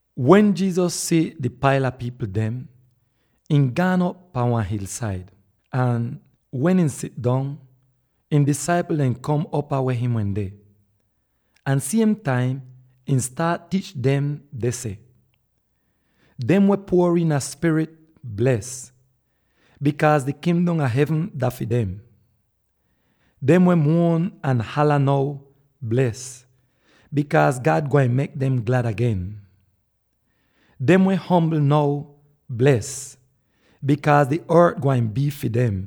Wen Jesus si di paila pipl dem, ihn gaan op pan wan hilsaid. Ahn wen ihn sidong, ihn disaipl dem kom upaa ihn wende, ahn siem taim ihn staat tiich dem deh seh, “Dem weh puor iina spirit, bles; bikaaz di Kingdom a Hevn dah fi dem! Dem weh muon ahn hala now, bles; bikaaz God gwain mek dem glad agen. Dem weh ombl now, bles; bikaaz di ort gwain bii fi dem.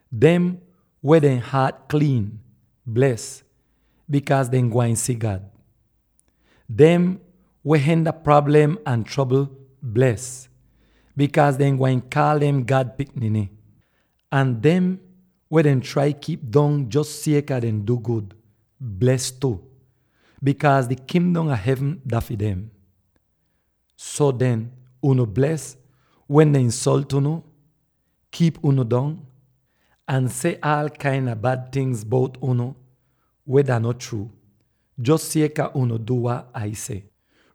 Dem weh dehn haat kliin, bles; bikaaz dehn gwain si God. Dem weh henda prablem ahn trobl, bles; bikaaz dehn gwain kaal dem God pikniny. Ahn dem weh dehn trai kiip dong jos sieka dehn du gud, bles tu; bikaaz di Kingdom a Hevn dah fi dem. “So den, unu bles, wen dehn insolt unu, kiip unu dong, ahn seh aal kain a bad ting bout unu weh dah no so, jos sieka unu du weh Ah seh.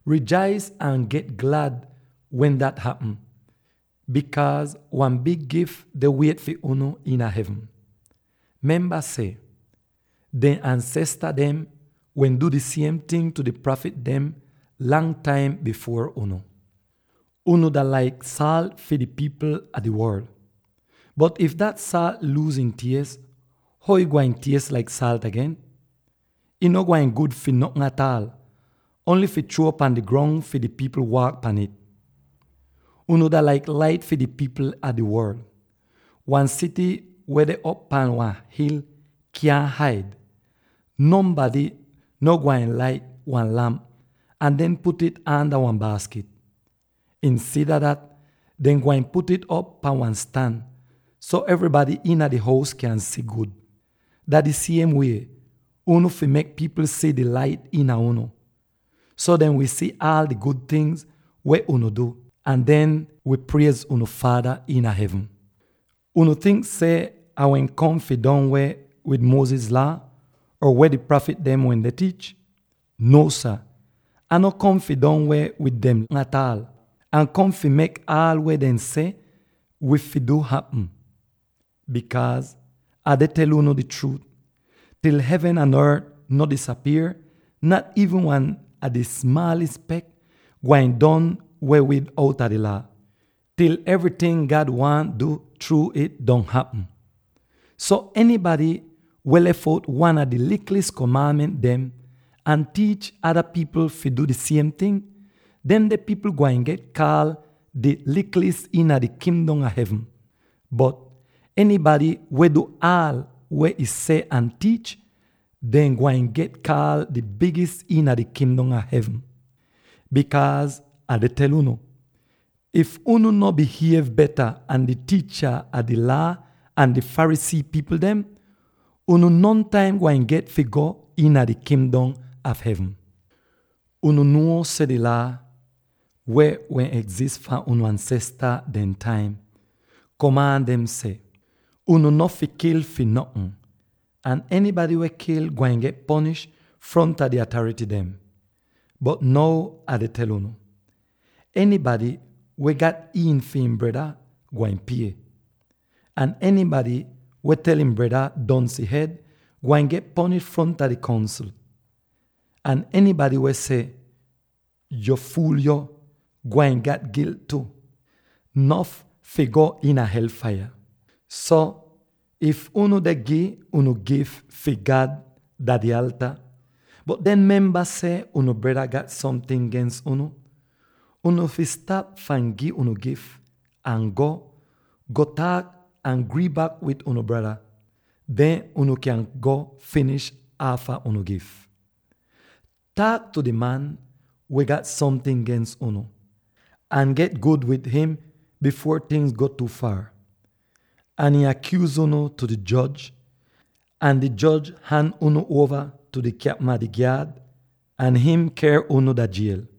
Rijais ahn get glad wen dat hapm, bikaaz wan big gif deh wiet fi unu iina hevn. Memba seh: dehn ansesta dem wehn du di siem ting tu di prafit dem lang taim bifuor unu. “Unu dah laik saalt fi di pipl fahn di worl. Bot if dah saalt luuz ih ties, how ih gwain ties laik saalt agen? Ih no gwain gud fi notn ataal, ongl fi chruo pan di grong fi pipl waak pahn ih. “Unu dah laik lait fi di pipl fahn di worl. Wan sity weh deh op pahn wan hil kyaahn haid. Nonbady no gwain lait wan lamp ahn den put'ih aanda wan baaskit. Insida dat dehn gwain put'ih op pan wan stan, so evrybady iina di hous kyan si gud. Dah di siem wie, unu fi mek pipl si di lait iina unu, so dehn wi si aal di gud ting weh unu du, ahn dehn wi priez unu Faada iina hevn. “Unu tink seh Ah wehn kom fi don weh wid Moses Laa or weh di prafit dem wehn tiich? Nuo sah, Ah no kom fi don weh wid dem ataal; Ah kom fi mek aal weh dehn seh wi fi du hapm. Bikaaz Ah deh tel unu di chruut: til hevn ahn ort no disapier, nat iivn wan a di smaalis spek gwain don weh wid outa di Laa, til evryting God waahn du chruu'ih, don hapm. So enybady weh lef out wan a di likil'is komaanment dem ahn tiich ada pipl fi du di siem ting, demde pipl gwain get kaal di likil'is iina di Kingdom a Hevn. Bot enybady weh du aal weh ih seh ahn tiich, dehn gwain get kaal di bigis iina di Kingdom a Hevn. Bikaaz Ah deh tel unu: if unu no bihiev beta an di tiicha a di Laa ahn di Pharisee pipl dem, unu nontaim gwain get fi go iina di Kingdom a Hevn! “Unu nuo seh di Laa —weh wehn egzis fahn unu ansesta dehn taim— komaan dem seh: ‘Unu no fi kil fi notn,’ ahn ‘Enybady weh kil gwain get ponish fronta di atarity dem.’ Bot now Ah deh tel unu: enybady weh gat iin fi ihn breda, gwain pie. Ahn enybady weh tel ihn breda ‘donsy hed!’ gwain get ponish fronta di Kongsl. Ahn enybady weh seh ‘Yo fuul yo!’ gwain gat gilt tu, nof fi go iina hel faiya. So, if unu deh gi unu gif fi God dah di alta, bot den memba seh unu breda gat somting gens unu, unu fi stap fahn gi unu gif, ahn go, go taak ahn grii bak wid unu breda. Den unu kyan go finish aafa unu gif. “Taak tu di man weh gat somting gens unu, ahn get gud wid im bifuor tingz go tu faar, ahn ihn akyuuz unu tu di joj, ahn di joj han unu uova tu di kyapm a di gyaad, ahn ihn ker unu dah jiel!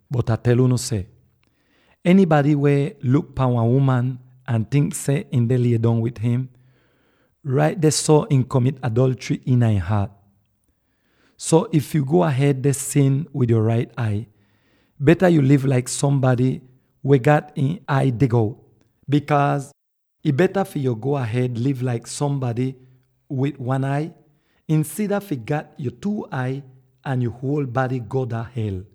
Bot Ah tel unu seh enybady weh luk pahn wan uman ahn tink seh ihn deh lidong wid im, rait dehso ihn komit adolchry iina ihn haat. So, if yu go ahed deh sin wid yo rait ai, beta yo liv laik sombady weh gat ihn ai dig out, bikaaz ih beta fi yo go ahed liv laik sombady wid one ai, insida fi gat yo two ai ahn yo huol bady go dah hel.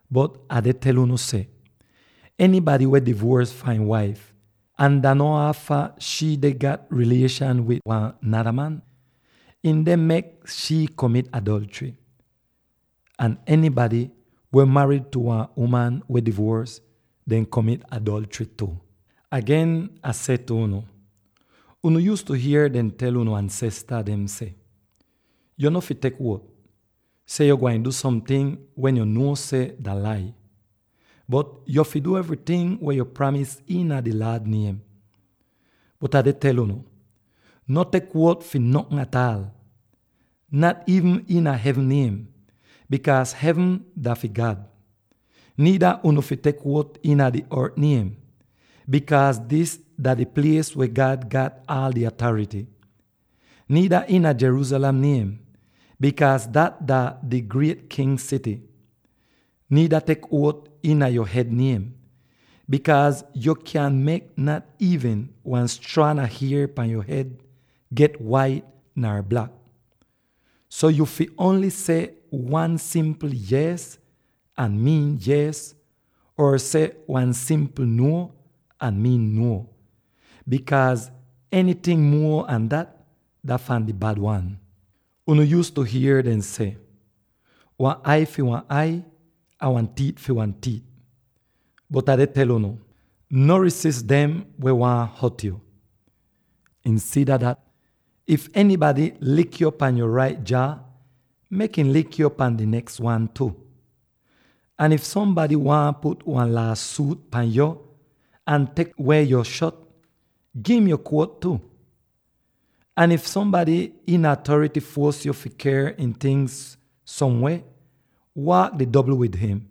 Bot Ah deh tel unu seh, ‘Enybady weh divuors fahn ihn waif —ahn dah no aafa shii deh gat rilieshan wid wan nada man— ihn deh mek shii komit adolchry. Ahn enybady weh marid tu wan uman weh divuors, deh komit adolchry tu.’ “Agen, Ah seh tu unu: unu yuuztu hier dehn tel unu ansesta dem seh, ‘Yo no fi tek uot Nuotis seh: Wan uot dah wat yo seh dah chruu-chruu. seh yo gwain du somting wen yo nuo seh dah lai,’ bot ‘Yo fi du evryting weh yo pramis iina di Laad niem.’ Bot Ah deh tel unu: no tek uot fi notn ataal, nat iivn iina hevn niem, bikaaz hevn dah fi God, niida unu fi tek uot iina di ort niem, bikaaz dis dah di plies weh God gat aal di atarity, niida iina Jerusalem niem, bikaaz dat dah di griet King sity. Niida tek uot iina yo hed niem, bikaaz yo kyaahn mek nat iivn wan straan a hier pan yo hed get wait nar blak. So, yuu fi ongl seh wan simpl ‘yees,’ ahn miin ‘yees,’ or seh wan simpl ‘nuo,’ ahn miin ‘nuo.’ Bikaaz enyting muo an dat, dah fahn di Bad Wan. “Unu yuuztu hier dehn seh, ‘Wan ai fi wan ai, ahn wan tiit fi wan tiit.’ Bot Ah deh tel unu: no rizis dem weh waahn hot yo. Insida dat, if enybady lik yo pan yo rait jaa, mek ihn lik yo pan di neks wan tu. Ahn if sombady waahn put wan laa-suut pan yo ahn tek weh yo shot, gi'im yo jakit tu. Ahn if sombady iina atarity fuos yo fi ker ihn tingz somweh, waak di dobl wid im.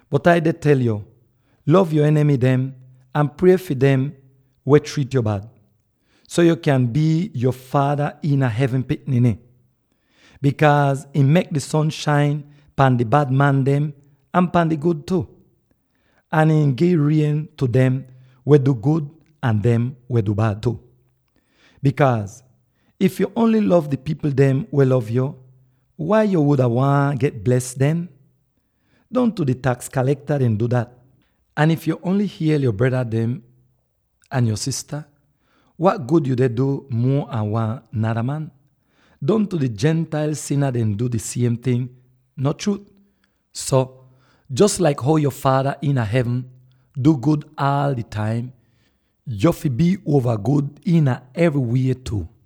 Bot Ai deh tel yo: Lov yo enimy dem, ahn prie fi dem weh triit yo bad, so yo kyan bii yo Faada iina hevn pikniny. Bikaaz ihn mek di son shain pahn di bad man dem ahn pahn di gud tu, ahn ihn gi rien tu dem weh du gud ahn dem weh du bad tu. Bikaaz, if yo ongl lov di pipl dem weh lov yo, wai yo wuda waahn get bles den? Dongtu di taks kalekta dem du dat. Ahn if yo ongl hiel yo fren dem, wat gud yu deh du muo an wan nada man? Dongtu di Gentile sina dem du di siem ting, no chruut? So jos laik how yo Faada iina hevn du gud aal di taim, yo fi bii uova gud iina evrywie tu.